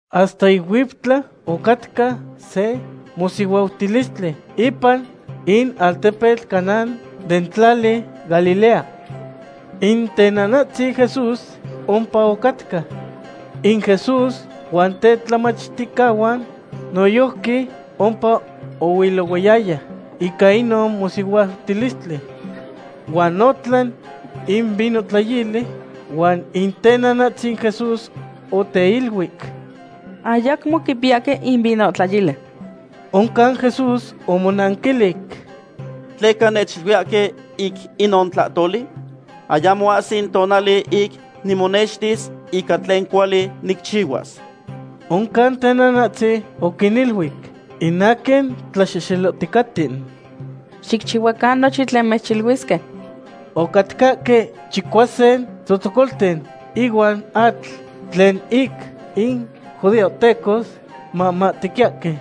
Hasta ic huiptla ocatca se mosihuautilistli ipan in altepetl Caná den tlali Galilea. In tenanahtzin Jesús ompa ocatca. In Jesús huan tetlamachticahuan noyojqui ompa oihilohuaya ica inon mosihuautilistli. Huan otlan in vinohtlayili, huan in tenanahtzin Jesús oteiluic: ―Ayacmo quipiyahque in vinohtlayili. Oncan Jesús omonanquilic: ―¿Tleca nechiluiyahque ic inon tlahtoli? Ayamo ahsi in tonali ic nimonextis ica tlen cuali nicchihuas. Oncan tenanahtzin oquiniluic in aquin tlaxehxelohticaten: ―Xicchihuacan nochin tlen mechiluisque. Ocatcahque chicuasin tzotzocolten ihuan atl tlen ic in judeahtecos mamahtequiyahque.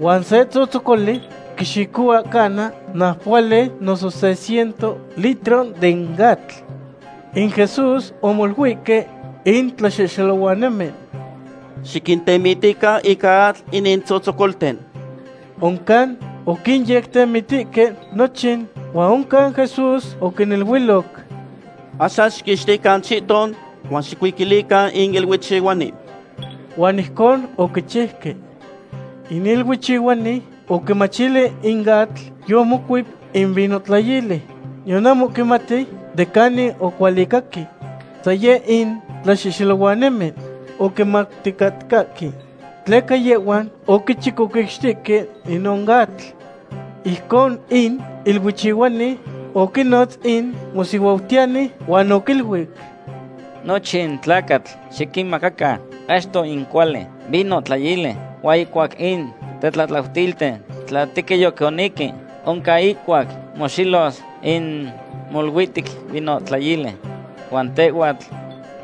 Huan se tzotzocoli quixicohua cana naupohuali noso se ciento litro den atl. In Jesús omoluihque in tlaxehxelohuanimen: ―Xiquintemitican ica atl inin tzotzocolten. Oncan oquinyectehtemitihque nochin, huan oncan Jesús oquiniluiloc: ―Axan xiquixtican chihton, huan xicuiquilican in iluichihuani. Huan ijcon oquichiuque. In iluichihuani oquimachili in atl yomocuep in vinohtlayili, niyan ahmo quimati de canin ocualicaque. San yeh in tlaxehxelohuanimen oquimauticatcahque, tleca yehhuan oquichicoquixtihque inon atl. Ijcon in iluichihuani oquinotz in mosihuautiyani huan oquiluic: ―Nochin tlacatl xiquinmahmaca achto in cuali vinohtlayili, huan ihcuac in tetlatlautilten tla tequin yoconihque, oncan ihcuac moxelos in moluihtic vinohtlayili. Huan tehhuatl,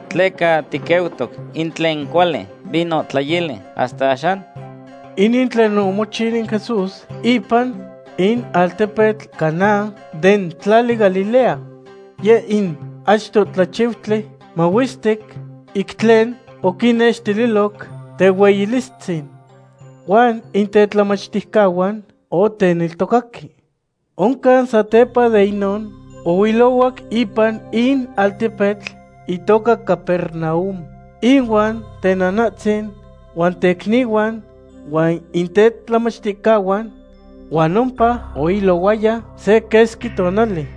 ¿tleca tiqueutoc in tlen cuali vinohtlayili hasta axan? Inin tlen omochiu in Jesús ipan in altepetl Caná den tlali Galilea. Yeh in achto tlachiutli mahuestic ic tlen oquinnextiloc tehueyilistzin. Huan in tetlamachticahuan oteneltocaque. Oncan satepa de inon ohuilohuac ipan in altepetl itoca Capernaum, inuan tenanahtzin huan tecnihuan huan in tetlamachticahuan. Huan ompa oihilohuaya se quesqui tonali.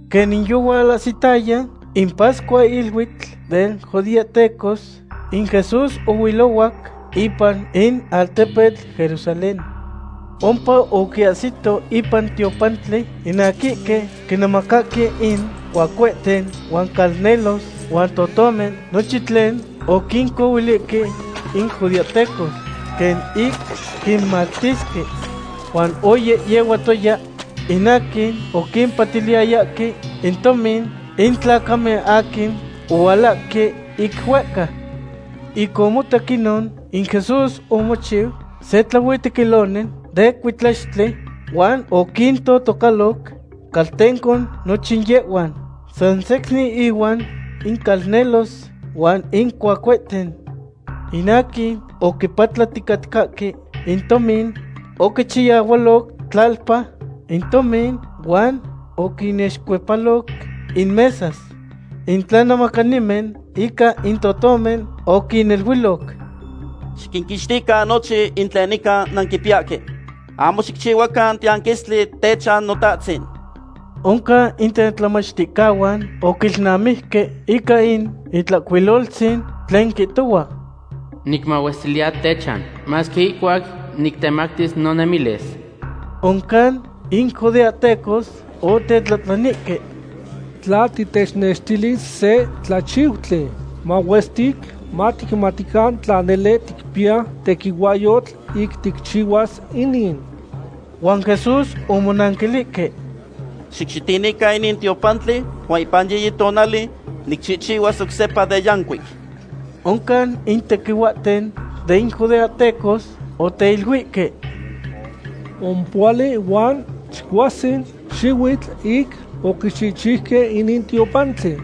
Quenin yohualahsitaya in pascuahiluitl den judeahtecos, in Jesús ohuilohuac ipan in altepetl Jerusalén. Ompa oquinahsiloc ipan in tiopantli in aquihque quinemacahque in cuacuehten huan calnelos huan totomen, nochin tlen oquincohuilihque in judeahtecos quen ic quinmactisque. Huan oyehyehuatoya in aquin oquimpatiliyayahque in tomin in tlacamen aquin ohualahque ic huehca. Ic omotac inon, in Jesús omochiu se tlahuitequiloni den cuitlaxtli huan oquintotocaloc caltenco nochin yehhuan, sansecnin inuan in calnelos huan in cuacuehten. In aquin oquipatlaticatcahque in tomin, oquichayahualoc tlalpa in tomin huan oquinixcuepaloc in mesas. In tlanemacanimen ica in totomen oquiniluiloc: ―Xiquixtican nochin tlen nican nanquipiyahque. ¡Ahmo xicchihuacan tiyanquistli techan Notahtzin! Oncan in tetlamachticahuan oquilnamijque ica in Itlahcuiloltzin tlen quihtohua: “Nicmahuestiliya techan masque ihcuac nictemactis nonemilis.” Oncan in judeahtecos otetlahtlanihque: ―Tla titechnextilis se tlachiutli mahuestic, maticmatican tla nele ticpiya tequihuahyotl ic ticchihuas inin. Huan Jesús omonanquilihque: ―Xicxitinican inin tiopantli huan ipan yiyi tonali nicchihchihuas oc sepa de yancuic. Oncan in tequihuahten den judeahtecos oteiluihque: ―Ompohuali huan chicuasin xihuitl ic oquichihchiuque inin tiopantli,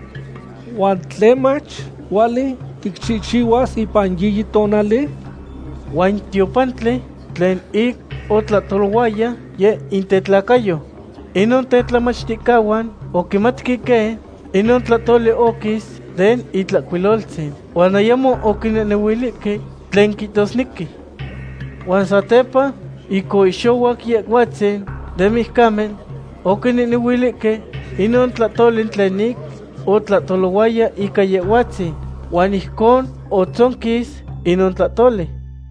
¿huan tlemach, cuali ticchihchihuas ipan yiyi tonali? Huan in tiopantli tlen ic otlahtolohuaya, yeh in tetlacayo. Inon tetlamachticahuan oquimatque quen inon tlahtoli oquis den Itlahcuiloltzin, huan ayamo oquinehhnehuilihque tlen quihtosnequi. Huan satepa ic oihxohuac Yehhuatzin de mijcamen, oquinehnehuilihque inon tlahtoli tlen ic otlahtohuaya ica Yehhuatzin, huan ijcon otzonquis inon tlahtoli.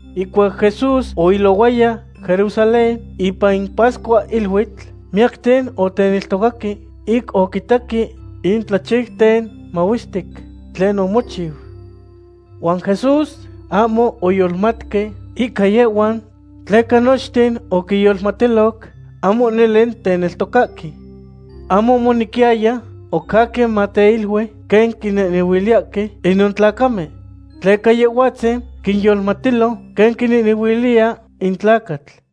Ihcuac Jesús oilohuaya Jerusalén, ipan in pascuahiluitl, miyacten oteneltocaque ic oquitaque in tlachiuten mahuestic tlen omochiu. Huan Jesús ahmo oyolmatque ica yehhuan, tleca nochten oquinyolmatiloc ahmo nele teneltocahque. Ahmo omonequiyaya oc aquin mateilui quen quinehnehuiliyahque inon tlacamen, tleca Yehhuatzin quinyolmatilo quen quinehnehuiliya in tlacatl.